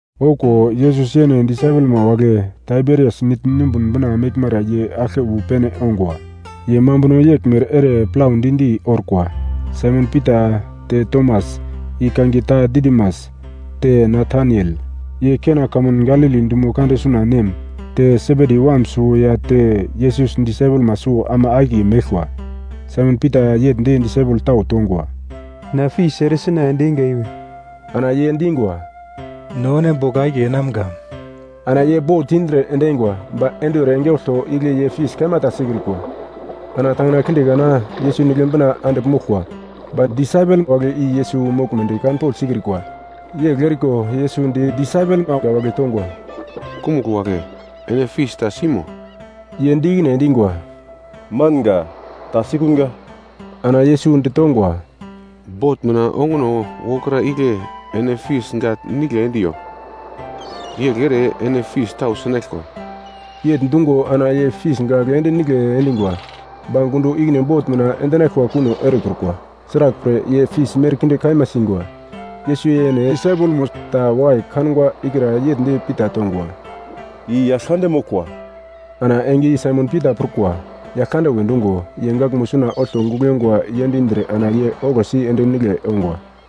Okuwo, Yesus yene disaipelma wagle Taiberias Nigl numbun bina meglmara ye aglke wu pene ongwa. Ye mambuno yeglmere ere plaudi-di orkwa. Saimon Pita, te Tomas (i kangiye ta Didimas) te Nataniel, ye Kena kamun Galili dumo kande suna nem, te Sebedi wam suwo ya te Yesus disaipelma suwo ama akiye meglkwa. Saimon Pita yegl di disaipel tau tongwa, “Na fis ere sina ende einga iwe.” Ana ye dingwa, “No ene bogl akiye enamga.” Ana ye bot indre ende eingwa, ba enduwer enge olto igle ye fis kaima ta sikrikwa. Ana tangina kinde kana, Yesus nigle bina andigl moglkwa, ba disaipel wagle i Yesus moglmedi kanpogl sikrikwa. Yegl eriko Yesus di disaipelma wagle tongwa, “Kumugl wagle, ene fis ta simo?” Ye di ikine endingwa, “Manga, ta sikunga.” Ana Yesus ditongwa, “Bot mina onguno wokra igle ene fis gagl nigle endiyo, yegl ere ene fis tau sinaglkwa.” Yegl dungo ana ye fis gagl ende nigle endingwa, ba gundo ikine bot mina endinaglkwa kuno erekrukwa, sraglpre ye fis merkinde kaima singwa. Yesus yene disaipelmo ta wakai kangwa ikra yegl di Pita tongwa, “I Yaglkande moglkwa!” Ana enge i Saimon Pita prukwa, Yaglkande we dungo, ye gaglmo suna olto gugl yongwa yendindre ana ye oglosi ende nigle ongwa.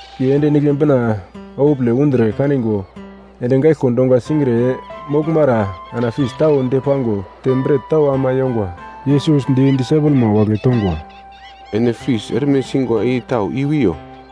Ye ende nigle bina okupole undre kanigwa endi gaiglko dongwa singre moglmara ana fis tau depango te bret tau ama yongwa. Yesus di disaipelma wagle tongwa, “Ene fis erme singwa i tau i-wiyo?”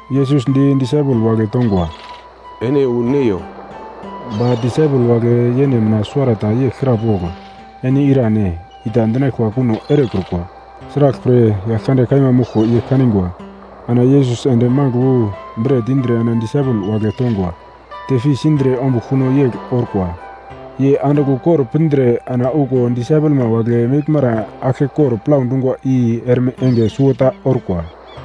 Yesus di disaipel wagle tongwa, “Ene wu neiyo.” Ba disaipel wagle yene mina suwarata yegl krapogl, “Ene irane?”, i ta dinaglkwa kuno erekrukwa. Sraglpre Yaglkande kaima moglko ye kanigwa. Ana Yesus ende magl wu bret indre ana disaipel wagle tongwa, te fis indre ombugl kuno yegl orkwa. Ye andigl ukor pindre ana okuwo disaipelma wagle meglmara aglkekor plau dungwa i erme enge suwota orkwa.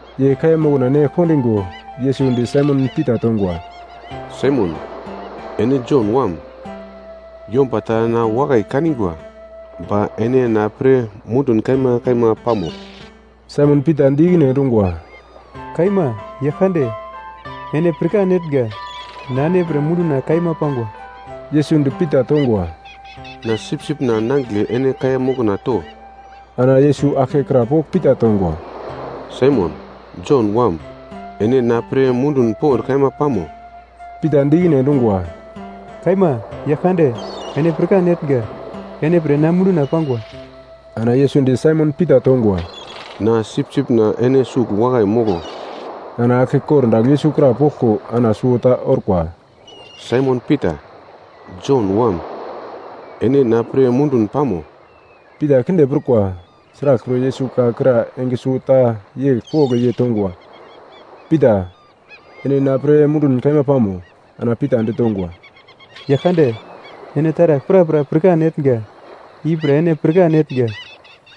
Ye kaiya mokna ne kondingo, Yesus di Saimon Pita tongwa, “Saimon, ene Jon wam, yomba tau na wakai kanigwa ba ene na pre mundun kaima kaima pamo?” Saimon Pita di ikine endungwa, “Kaima, Yaglkande, ene pirkan etnga, na ene pre munduna kaima pangwa.” Yesus di Pita tongwa, “Na sipsipna nangigle ene kaiya mokna to.” Ana Yesus aglke krapogl Pita tongwa, “Saimon, Jon wam, ene na pre mundun pond kaima pamo?” Pita di ikine endungwa, “Kaima, Yaglkande, ene pirkan etnga, ene pre na munduna pangwa.” Ana Yesus di Saimon Pita tongwa, “Na sipsipna ene sugl wakai moglo.” Ana aglke kordagl Yesus krapoglko ana suwota orkwa, “Saimon Pita, Jon wam, ene na pre mundun pamo?” Pita kinde prukwa, sraglpre Yesus ka kra enge suwota yegl pogl ye tongwa, “Pita, ene na pre mundun kaima pamo?” Ana Pita ditongwa, “Yaglkande ene taragl prapra pirkan etnga, ipre ene pirkan etnga,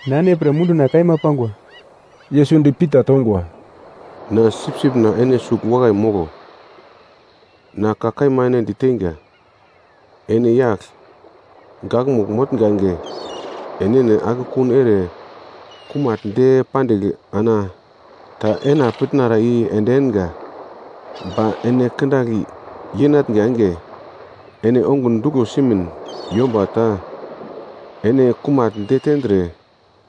na ene pre munduna kaima pangwa.” Yesus di Pita tongwa, “Na sipsipna ene sugl wakai moglo. Na ka kaima ene diteinga, ene yagl gakmugl motnga enge, enene akekun ere kumagl de pandigl ana ta ena pitnara i ende enga, ba ene kindagl yenatnga enge ene ongun duglo simin yomba ta ene kumagl detendre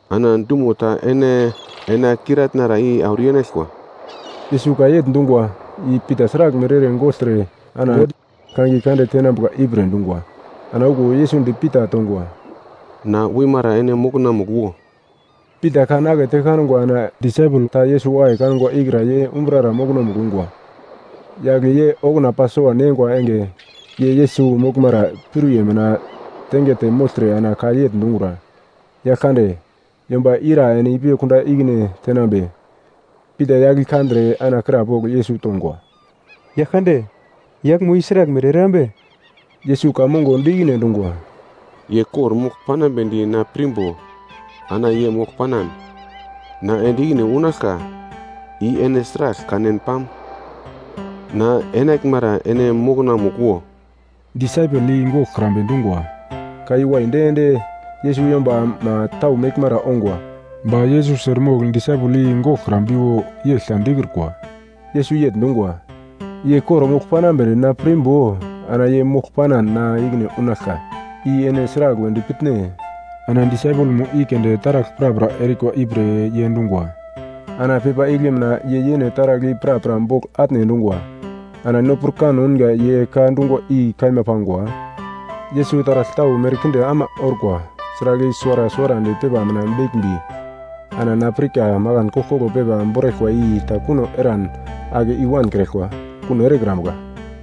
ana dumo ta ene enakiratnara i auro yenaglkwa.” Yesus ka yegl dungwa, i Pita sraglmere ere gogltre ana God kangiye kande tenambuka ipre dungwa. Ana okuwo Yesus di Pita tongwa, “Na wimara ene mokonamugl wo.” Pita kan akete kangwa ana disaipel ta Yesus wakai kangwa ikra ye umbrara mokonomugl ungwa, yagle ye okuna Pasova neingwa enge ye Yesus moglmara piuriye mina tengete mogltre ana ka yegl dungura, “Yaglkande, yomba ira ene ipi kunda ikine tenambe?” Pita yagl i kandre ana krapogl Yesus tongwa, “Yaglkande, yaglmo i sraglmere erambe?” Yesus ka mongo di ikine endungwa, “Ye kor-mogl panambedi na pirmbo ana ye mogl panan na ende ikine unaglka, i ene sragl kanen pam? Na enaglmara ene mokonamugl wo.” Disaipel i goglkrambe dungwa, ka i waidi ende Yesus yombama tau meglmara ongwa. Ba Yesus eremogl disaipel i goglkrambiwo, yegl ta dikrukwa. Yesus yegl dungwa, “Ye kor-mogl panambedi na pirmbo ana ye mogl panan na ikine unaglka, i ene sragl wedi pitne?” Ana disaipelmo i keunde taragl prapra erikwa ipre ye dungwa, ana pepa igle mina ye yene taragl i prapra bogl atne endungwa. Ana no pirkan ounga ye ka dungwa i kaima pangwa. Yesus taragl tau merkinde ama orkwa, sragl i suwara suwarandi pepa mina beglmbi, ana na pirka makan koglkoglo pepa boraglkwa i ta kuno eran ake i-wankraglkwa kuno erekrambuka.